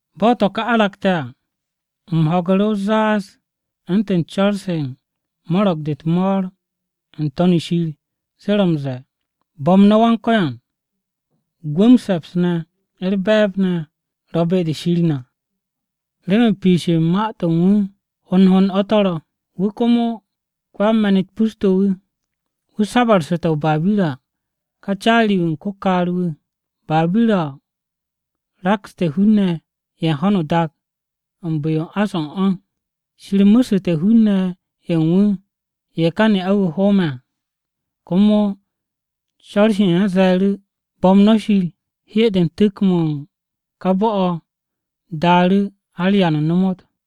Bo̱ to̱ ka aragte̱ à, u̱m ho̱gu̱ru̱ o-zaaz u̱ntu̱n co̱r-se u̱n mo̱ro̱g-de u̱t-mo̱o̱r n-To̱n o̱ Shir se ro̱ m-ze̱e̱, “Bo̱m no̱ Yawe! Gwu̱, m-se̱ps ne̱, u̱r-be̱e̱b ne̱ ro̱ be-de Shir na! Remen piish u̱n ma-u̱t u̱n wu̱ hond hond to̱ ro̱, wu̱ komo ko-yan-me̱n-u̱t pus-to̱ wu̱, Wu̱ sabu̱rsu̱te̱ o-Babira ká caari-wu̱ u̱n ko-kaar-wu̱, Babira-o rakste̱ hun-ne̱ ye̱ u̱n ho̱no o-dak u̱n bu̱-yo u̱n ás-o̱ u̱n o̱. Shir mu̱su̱te̱ hun-ne̱ ye̱ u̱n wu̱ ye̱ ká ne'a-wu̱ hoome̱ à.” Komo co̱r-se u̱n ye̱ ze̱e̱ru̱, “Bo̱m no̱ Yawe! Hye-de u̱n tu̱k-mo̱ u̱n ká bo̱-o̱ daaru̱ har da-o̱ ba m-ta.”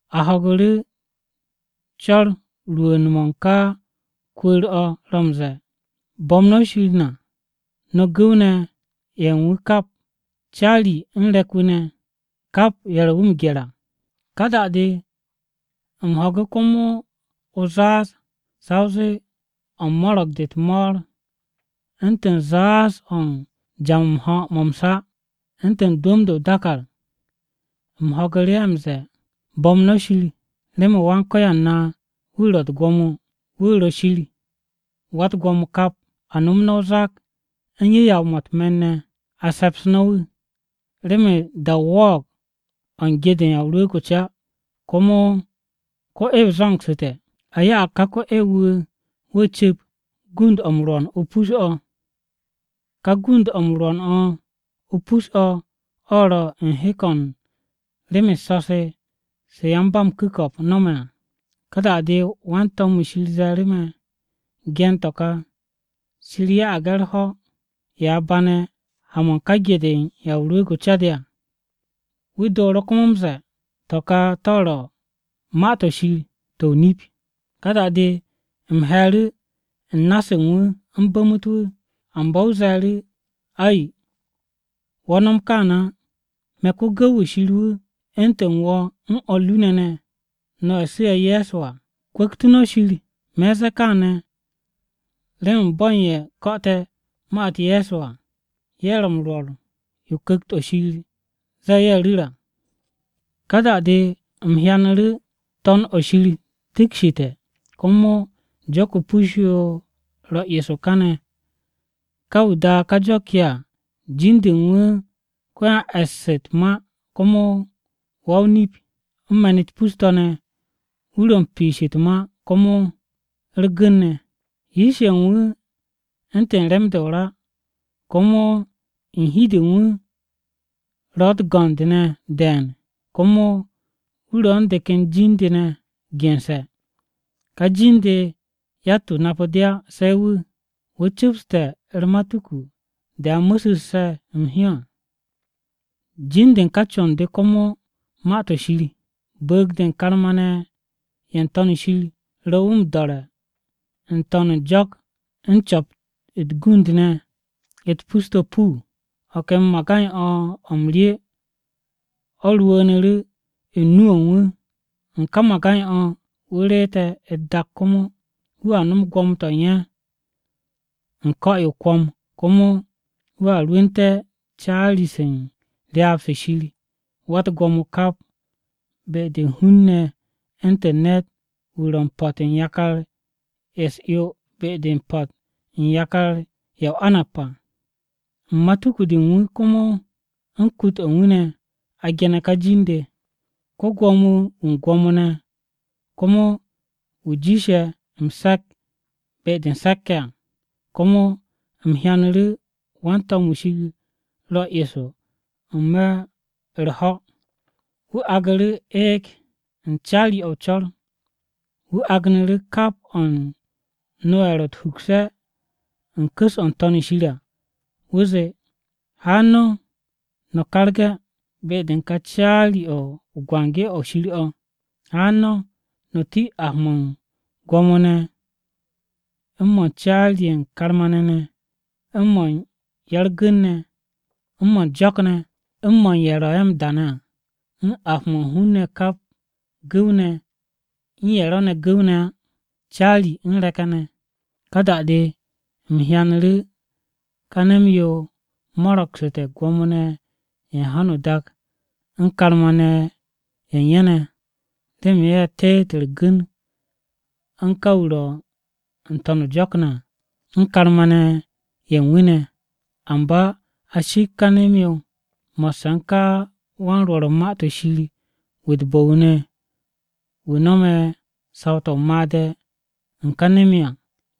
A ho̱gu̱ru̱ o-co̱r rwu̱u̱n-mo̱ u̱n ká kwu̱u̱r-o̱ ro̱ m-ze̱e̱, “Bo̱m no̱ Shir na, no̱ gu̱w-ne̱ ye̱ u̱n wu̱ kap, Caari u̱n re̱k-wu̱ ne̱, kap ye̱ ro̱ wu̱ m-gye̱r à.” Ka da-de u̱m ho̱gu̱ komo o-zaaz sa o zee o̱ u̱n mo̱ro̱g-de u̱t-mo̱o̱r, u̱ntu̱n zaaz-o̱ u̱n ja-mo̱ m-ho̱ mo̱ m-sa, u̱ntu̱n dwu̱m-de o-dàkàr. U̱m ho̱gu̱ru̱ ye̱ m-ze̱e̱, “Bo̱m no̱ Yawe! Remen Wan-Ko̱yan na wu̱ ro̱ u̱t-gwo̱mo, wu̱ ro̱ Shir Wa-u̱t-Gwo̱mo kap! A nom no̱ o-zak u̱n yu̱yaw-mo̱ u̱t-me̱n ne̱, a se̱ps no̱ wu̱! Remen da-o wo̱o̱g o̱ u̱n ge-de u̱n Ya o-Rwu̱u̱g o-Ca, komo ko-'ew zo̱ngsu̱te̱. A ya'ag ká ko-'ew-wu̱, wu̱ cu̱p gund-o̱ m-rwo̱n o-pus o̱.” (Ka gund-o̱ m-rwo̱n o̱ o-pus o̱ ro̱ u̱n hek-o̱ u̱n rem-u̱s so̱-se se yan-ba-m-ku̱ko̱p no̱me̱ à.) Ka da-de wan-to̱m-wu̱ Shir ze̱e̱ru̱ me̱. “Gen to̱ kà: ‘Shir ya'ag ye̱ u̱r-ho̱ ye̱ a bane̱ ha-mo̱ u̱n ka ge-de u̱n Ya o-Rwu̱u̱g o-Ca de à.’” Wu̱ dooru̱ komo m-ze̱e̱, “To̱ ka to̱ ro̱ Ma-to̱ Shir to̱ o-nip.” Ka da-de u̱m he̱e̱ru̱ u̱n na-se u̱n wu̱ u̱m bu̱mu̱t wu̱. Amba wu̱ ze̱e̱ru̱, “Ay, wo̱ no̱m kaane̱ á! Me̱ ko-gu̱w-wu̱ Shir wu̱, u̱ntu̱n wo̱ u̱n o̱r ru ne̱ ne̱, no̱ ye̱ su̱'e̱ Ye̱so à. Kwu̱ktu̱ no̱ Shir! Me̱ u̱n ze̱e̱ kaane̱ remen bo̱ u̱n ye̱ ko̱'o̱te̱ ma-u̱t Ye̱so à, ye̱ ro̱ m-rwo̱r yo Ku̱kt-o̱ Shir ze̱e̱ ye̱ ru̱r à.” Ka da-de u̱m hyanu̱ru̱ To̱n-o shir tikshite̱, komo jo̱k-o pus-yo ro̱ eso kaane̱. Ka wu̱ daa ká jo̱k-yo à, jin-de u̱n wu̱ Ko-yan-E̱ss u̱t-Ma komo Wa-o-Nip. U̱n me̱n-u̱t pus-to̱ wu̱ ro̱ u̱n piish u̱t-ma komo u̱r-gu̱n ne̱. Yish-ye̱ u̱n wu̱ u̱ntu̱n rem-de o-ra, komo u̱n hi-de u̱n wu̱ ro̱ u̱t-go̱nd ne̱ de̱e̱n. Komo wu̱ ro̱ u̱n de ken jin-de ne̱ gense̱. Ka jin-de yatt-wu̱ napu̱ de á se̱ wu̱. Wu̱ cu̱pste̱ u̱r-matuku de a mu̱su̱sse̱ m-hyó à. Jin-de u̱n ká con-de komo Ma-to̱ Shir. Bu̱u̱g-de u̱n karma-ne̱ ye̱ n-To̱n shir ro̱ wu̱ m-do̱re̱ n-to̱n u̱n jo̱k u̱n co̱p-to̱ u̱t-gund ne̱ pus-to̱ puu. O̱ ken magay-o̱ m-rye o̱ rwu̱u̱nu̱ru̱ u̱n nu-o̱ u̱n wu̱. U̱n ka magay-o̱ wu̱ reete̱ u̱t-dak. Komo, “Wu̱a nom gwo̱mo-to̱ u̱n ye̱ u̱n ko̱-yo o-kwo̱m.” Komo wu̱a rwu̱u̱te̱ caari-se u̱n ryaab-se Shir Wa-u̱t-Gwo̱mo Kap be-de u̱n hun-ne̱ u̱ntu̱n ne̱t-wu̱ ro̱ 'mo̱ u̱n yakar-ye̱ u̱s-'yo be-de a u̱n po̱t u̱t-us à. U̱n matuku-de u̱n wu̱, komo u̱n kut-o̱ u̱n wu̱ ne̱, a ge̱ne̱ ka jin-de: Ko-Gwo̱mo-wu̱ u̱n gwo̱mo-ne̱, komo wu̱ jiishe̱ m-se̱k be-de u̱n se̱k-ye̱ à. Komo u̱m hyanu̱ru̱ wan-to̱m-wu̱ Shir ro̱ eso n-me̱ u̱r-ho̱. Wu̱ aagu̱ru̱ eeg u̱n caari-o̱ o-co̱r wu̱ agnu̱ru̱ kap o̱ u̱n no-ye̱ ro̱ u̱t-hukse̱ u̱n ku̱s-o̱ n-To̱n shir à. Wu̱ zee, “Haan no̱, no̱ karge̱ be-de u̱n ka caari-o̱ o-biki o̱ Shir o̱. Haan no̱ no̱ ti ap-mo̱ u̱n gwo̱mo-ne̱, u̱n mo̱ u̱n caari-ye̱ u̱n karma-ne̱ ne̱, u̱n mo̱ u̱n ya-u̱r-gu̱n ne̱, u̱n mo̱ u̱n jo̱k-ne̱, u̱n mo̱ u̱n ye̱ ro̱ ye̱ m-da ne̱ à, u̱n ap-mo̱ hun-ne̱ kap, gu̱w-ne̱ u̱n ye̱ ro̱ gu̱w-ne̱ á, caari u̱n re̱k-ye̱ ne̱!” Ka da-de u̱m hyanu̱ru̱ ka nem-yo mo̱ro̱gsu̱te̱ gwo̱mo-ne̱ ye̱ u̱n ho̱no o-dak u̱n karma-ne̱ ye̱ u̱n ye̱ ne̱, remen ye̱ teet u̱r-gu̱n u̱n ka wu̱ ro̱ n-to̱n o-jo̱k à, u̱n karma-ne̱ ye̱ u̱n wu̱ ne̱. Amba a shipk ka nem-yo, mo̱sse̱ u̱n ka wan-rwo̱r u̱n ma-to̱ shir wu̱ u̱t-bo̱ wu̱ ne̱ wu̱ no̱me̱ saw-to̱ o-made̱ u̱n ka nem-yo à.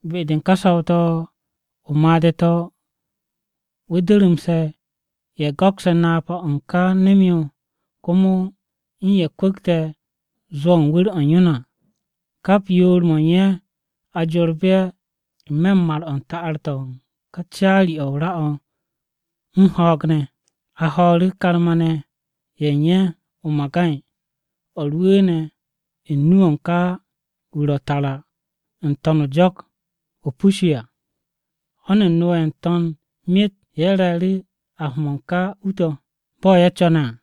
Be-de u̱n ka saw-to̱ o-made̱ to̱ wu̱ durumse̱ ye̱ go̱kse̱ napa-o̱ u̱n ká nem-yo, komo u̱n ye̱ kwu̱kte̱ zwo̱-o̱ u̱n wu̱r-o̱ u̱n yo ne̱ à. Kap yoor-mo̱ u̱n ye̱ a jorbu̱ ye̱ n-me̱ u̱n mar-o̱ u̱n ta'ar-to̱ u̱n caari-o̱ o-ra u̱n ho̱o̱g ne̱. A ho̱o̱ru̱ karma-ne̱ ye̱ u̱n ye̱ o-magay o̱ rwu̱u̱ne̱ u̱n nu-o̱ u̱n ká wu̱ ro̱ tara n-to̱n u̱n jo̱k-o o-pus yo à. Ho̱n u̱n no-ye̱ n-to̱n myet ye̱ re̱e̱ru̱ ap-mo̱ u̱n ká u-to̱ bo̱ ye̱ co̱ne̱ à.